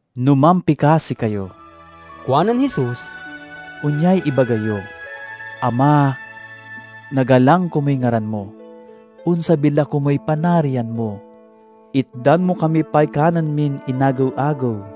"No mampikasi kayo," kuanen Jesus, "onyay ibaga yo: 'Ama: Nagalang komuy ngaran mo; onsabi la komuy Panarian mo. Itdan mo kami pay kanen min inagew-agew.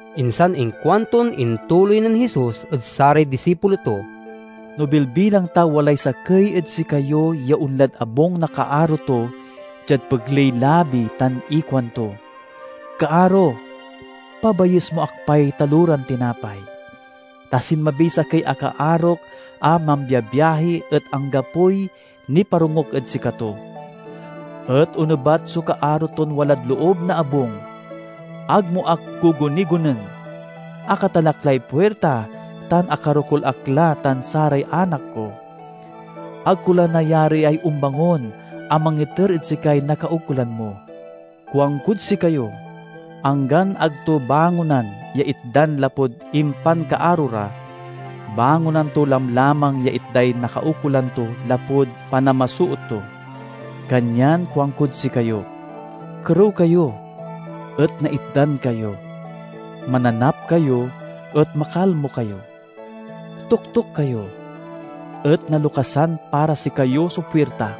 Insan inkuanton intuloy nen Jesus ed saray disipulo to, "No bilbilang ta walay sakey ed sikayo ya onlad abung na kaaro to diad pegley-labi tan ikuanto, 'Kaaro, pabayes mo ak pay taloran tinapay, ta sinmabiy sakey a kaarok a mambiabiahi et anggapoy niparongok ed sikato!' Et onebat so kaaro ton walad loob na abung, 'Ag mo ak gugunigonen! Akatalak lay puirta tan akarokul ak la tan saray anak ko. Ag ko la nayariay ombangon a mangiter ed sikay nakaukolan mo.' Kuankod sikayo, anggan ag to bangonan ya itdan lapud impankaaro ra, bangonan to lamlamang ya itday nakaukolan to lapud panamasoot to. Kanyan kuankod sikayo: Kerew kayo, et naitdan kayo. Mananap kayo, et makalmo kayo. Toktok kayo, et nalokasan para sikayo so puirta.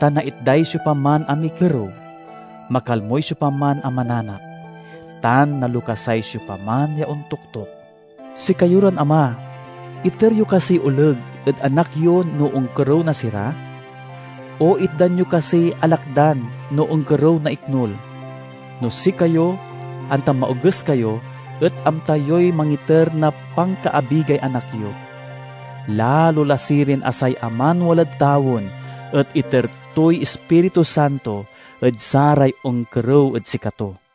Ta naitday siopaman a mikerew; makalmoy siopaman a mananap; tan nalokasay siopaman ya ontoktok. Sikayo ran ama, iter yo kasiy oleg ed anak yo no onkerew na sira? O itdan yo kasiy alakdan no onkerew na iknul? No sikayo, anta maoges kayo, et amta yoy mangiter na pankaabigay anak yo, lalo la sirin a say Aman walad tawen et iter toy Ispiritu Santo ed saray onkerew ed sikato."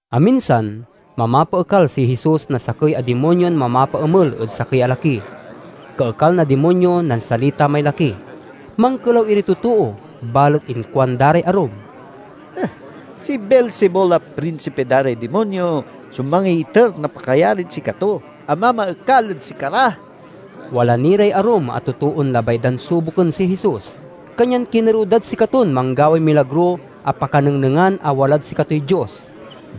Aminsan, mamapaekal si Jesus na sakey a dimonyon mamapaemel ed sakey a laki. Kaekal na dimonyo, nansalita may laki. Mankelaw iray totoo, balet inkuanda ray arum, "Si Beelzebul a prinsipi da ray dimonyo so mangiiter na pakayarid sikato a mamaekal ed sikara." Wala ni ray arum a totoon labay dan suboken si Jesus, kanyan kinerew dad sikaton manggaway milagro a pakanengnengan a walad sikatoy Dios.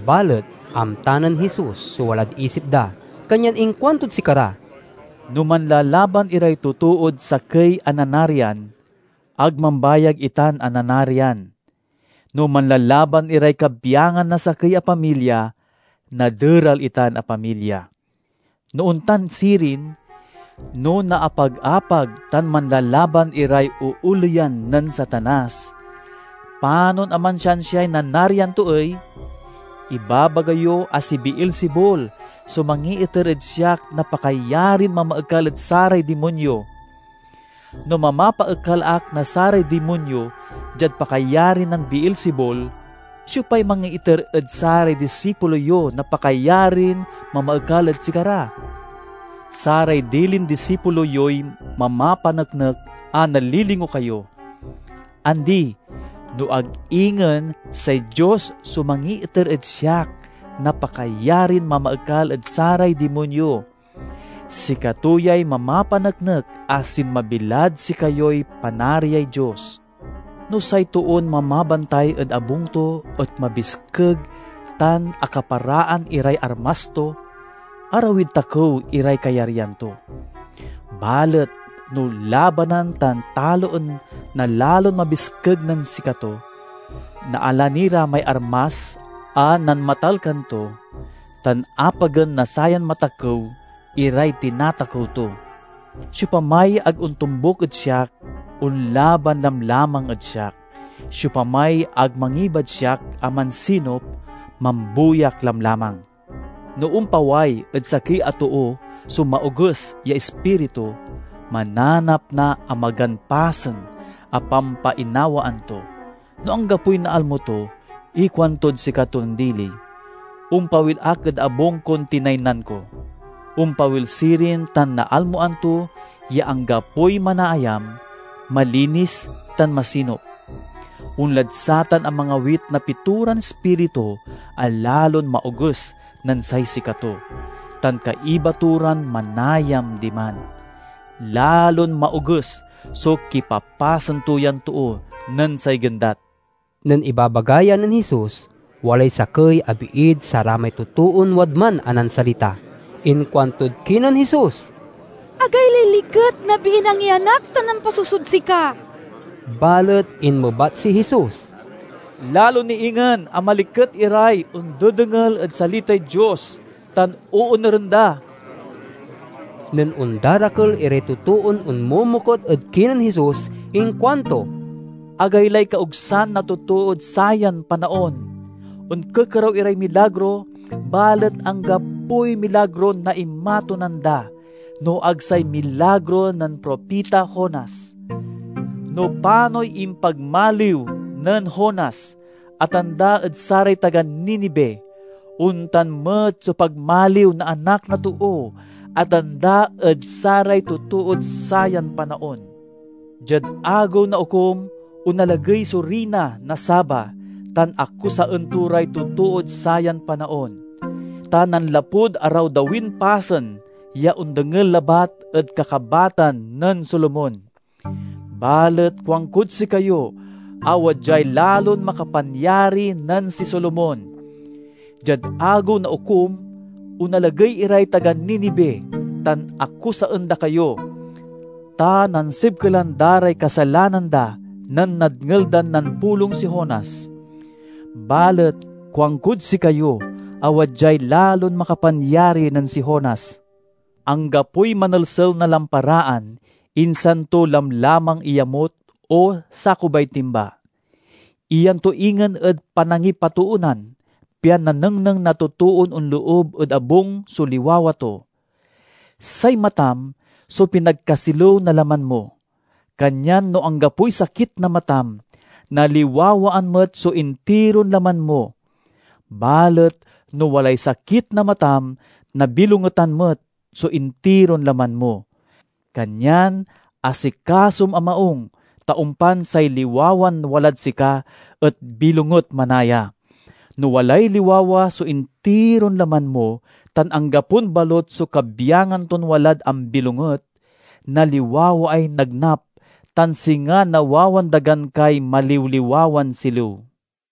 Balet amta nen Jesus so walad isip da, kanyan inkuantod sikara, "No manlalaban iray totood sakey a nanarian, ag mambayag itan a nanarian. No manlalaban iray kabyangan na sakey a pamilya, naderal itan a pamilya. No ontan sirin, no naapag-apag tan manlalaban iray ooleyan nen Satanas, panon a mansiansiay nanarian to ey? Ibabaga yo a si Beelzebul so mangiiter ed siak na pakayarin mamaekal ed saray dimonyo. No mamapaekal ak na saray dimonyo diad pakayari nen Beelzebul, siopay mangiiter ed saray disipulo yo na pakayarin mamaekal ed sikara? Saray dilin disipulo yoy mamapaneknek a nalilingo kayo! Andi, no ag ingen say Dios so mangiiter ed siak na pakayarin mamaekal ed saray dimonyo. Sikato yay mamapaneknek a sinmabi lad sikayoy Panariay Dios. "No say toon mamabantay ed abung to et mabiskeg tan akaparaan iray armas to, arawid takew iray kayaryan to. Balet no labanan tan taloen na lalon mabiskeg nen sikato, naala ni ra may armas a nanmatalkan to, tan apagen na sayan matakew iray tinatakew to. "Siopamay ag ontombuk ed siak, onlaban lamlamang ed siak. Siopamay ag mangibad siak a mansinup, mambuyak lamlamang." "No ompaway ed sakey a too so maoges ya ispiritu, mananap na amagan pasen a pampainawaan to. No anggapoy naalmo to, ikuantod sikaton dili, 'Ompawil ak ed abung kon tinaynan ko.' Ompawil sirin tan naalmoan to ya anggapoy manaayam, malinis, tan masinup. Onlad satan a mangawit na pitoran ispiritu a lalon maoges nen say sikato, tan kaiba to ran manayam diman. Lalon maoges so kipapasen to yan too nen say gendat." Nen ibabaga ya nen Jesus, walay sakey a biid saramay totoon wadman a nansalita. Inkuantod kinen Jesus, "Agaylay liket na biin angyanak tan nampasusod sika!" Balet inmebat si Jesus, "Lalo ni ingen a maliket iray ondedengel ed salitay Dios tan oonuren da!" Nen ondarakel iray totoon onmomokut ed kinen Jesus inkuanto, "Agaylay kaogsan na totood sayan panaon! Onkekerew iray milagro, balet anggapoy milagron naimatunan da no ag say milagro nen propita Jonas. No panoy impagmaliw nen Jonas a tanda ed saray taga Ninive, ontan met so pagmaliw na Anak na Too a tanda ed saray totood sayan panaon. Diad Agew na Okum, onalagey so Riyna na Saba tan akusaen to ray totood sayan panaon, ta nanlapud arawdawin pasen ya ondengel labat ed kakabatan nen Solomon. Balet kuankod sikayo a wadyay lalon makapanyari nen si Solomon. Diad Agew na Okum, onalagey iray taga Ninive tan akusaen da kayo, ta nansibkelan da ray kasalanan da nen nadngel dan nampulong si Jonas. Balet kuankod sikayo a wadyay lalon makapanyari nen si Jonas!" "Anggapoy manelsel na lamparaan, insan to lamlamang iyamut o sakubay timba. Iyan to ingen ed panangipatoonan, pian nanengneng na totoon onloob ed abung so liwawa to. Say matam so pinagkasilew na laman mo. Kanyan no anggapoy sakit na matam, naliwawaan met so intiron laman mo. Balet no walay sakit na matam, nabilongetan met so intiron laman mo. Kanyan asikasom a maung, ta ompan say liwawan walad sika et bilonget manaya. No walay liwawa so intiron laman mo tan anggapon balut so kabyangan ton walad ambilonget, naliwawaay nagnap, tan singa nawawandagan kay maliwliwawan silew."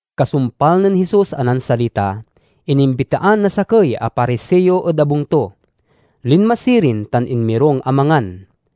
Kasumpal nen Jesus a nansalita, inimbitaan na sakey a Pariseo ed abung to. Linma sirin, tan inmirung a mangan.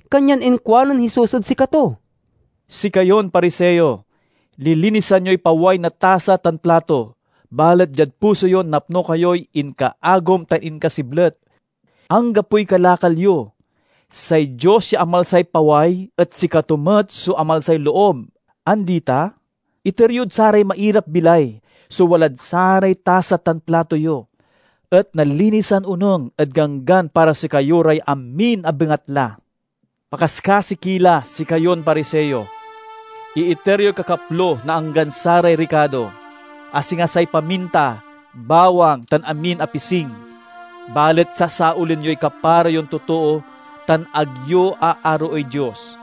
Kanyan inkuanen Jesus ed sikato, "Sikayon Pariseo, lilinisan yoy paway na tasa tan plato, balet diad puso yo napno kayoy inkaagum tan inkasiblet. Anggapoy kalakal yo! Say Dios ya amalsay paway et sikato met so amalsay loob, andi ta? Iter yod saray mairap-bilay so walad saray tasa tan plato yo, et nalinisan onung ed ganggan para sikayo ray amin a bengatla. "Pakaskasi ki la, sikayon Pariseo! Iiter yoy kakaplo na anggan saray rikato, a singa say paminta, bawang, tan amin a pising, balet sasaolen yoy kapara yon totoo tan ag yo aaroey Dios.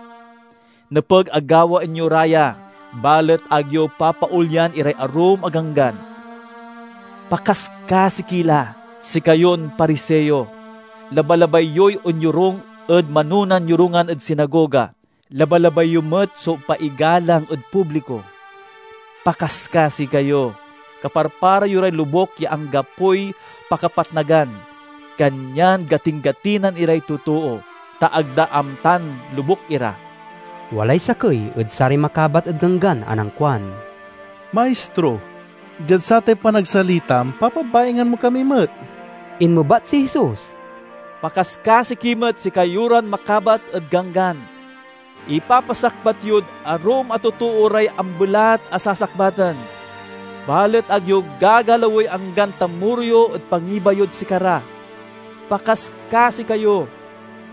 Nepeg a gawaen yo ra ya, balet ag yo papaolyan iray arum a ganggan. "Pakaskasi ki la, sikayon Pariseo! Labalabay yoy onyorung ed manonan yorungan ed sinagoga. Labalabay yo met so paigalang ed publiko. Pakaskasi kayo! Kaparpara yo ray lobuk ya anggapoy pakapatnagan, kanyan gatingatinan iray totoo, ta ag da amtan lobuk ira." Walay sakey ed saray makabat ed Ganggan a nankuan, "Maistro, diad satay panagsalitam, papabaingan mo kami met!" Inmebat si Jesus, "Pakaskasi ki met, sikayo ran makabat ed Ganggan! Ipapasakbat yod arum a totoo ray ambelat a sasakbaten, balet ag yo gagalawey anggan tamoro yo ed pangiba yod sikara. Pakaskasi kayo!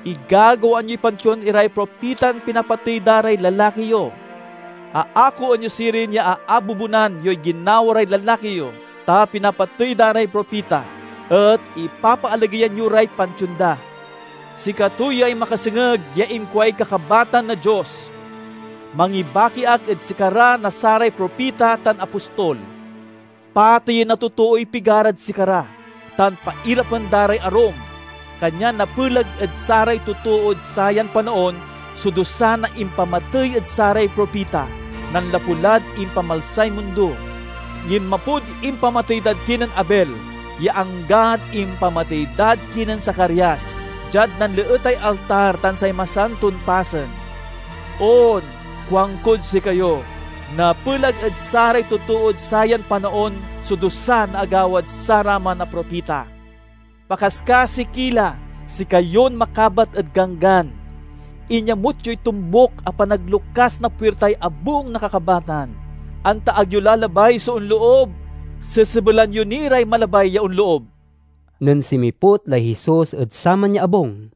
Igagawaan yoy pantion iray propitan pinapatey da ray lalaki yo. Aakoen yo sirin ya aabubonan yoy ginawa ray lalaki yo, ta pinapatey da ray propita, et ipapaalageyan yo ray pantion da. Sikato yay makasengeg ya inkuay Kakabatan na Dios, 'Mangibaki ak ed sikara na saray propita tan apostol. Pateyen na totooy pigarad sikara, tan pairapen da ray arum.' Kanyan napelag ed saray totood sayan panaon so dusa na impamatey ed saray propita, nanlapu lad impamalsay mundo. Ginmapod impamatey dad kinen Abel ya anggad impamatey dad kinen Zacarias diad nanleetay altar tan say Masanton Pasen. On, kuankod sikayo, napelag ed saray totood sayan panaon so dusa na agawad saraman a propita! "Pakaskasi ki la, sikayon makabat ed Ganggan! Inyamut yoy tombuk a panaglokas na puirtay abung na kakabatan. Anta ag yo la labay so onloob, sesebelan yo ni ray malabay ya onloob!" Nen sinmiput lay Jesus ed saman ya abung,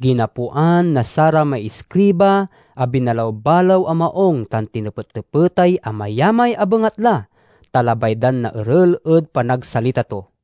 ginapoan na saramay iskriba a binalaw-balaw a maung tan tinepettepetay amayamay a bengatla, ta labay dan naeral ed panagsalita to.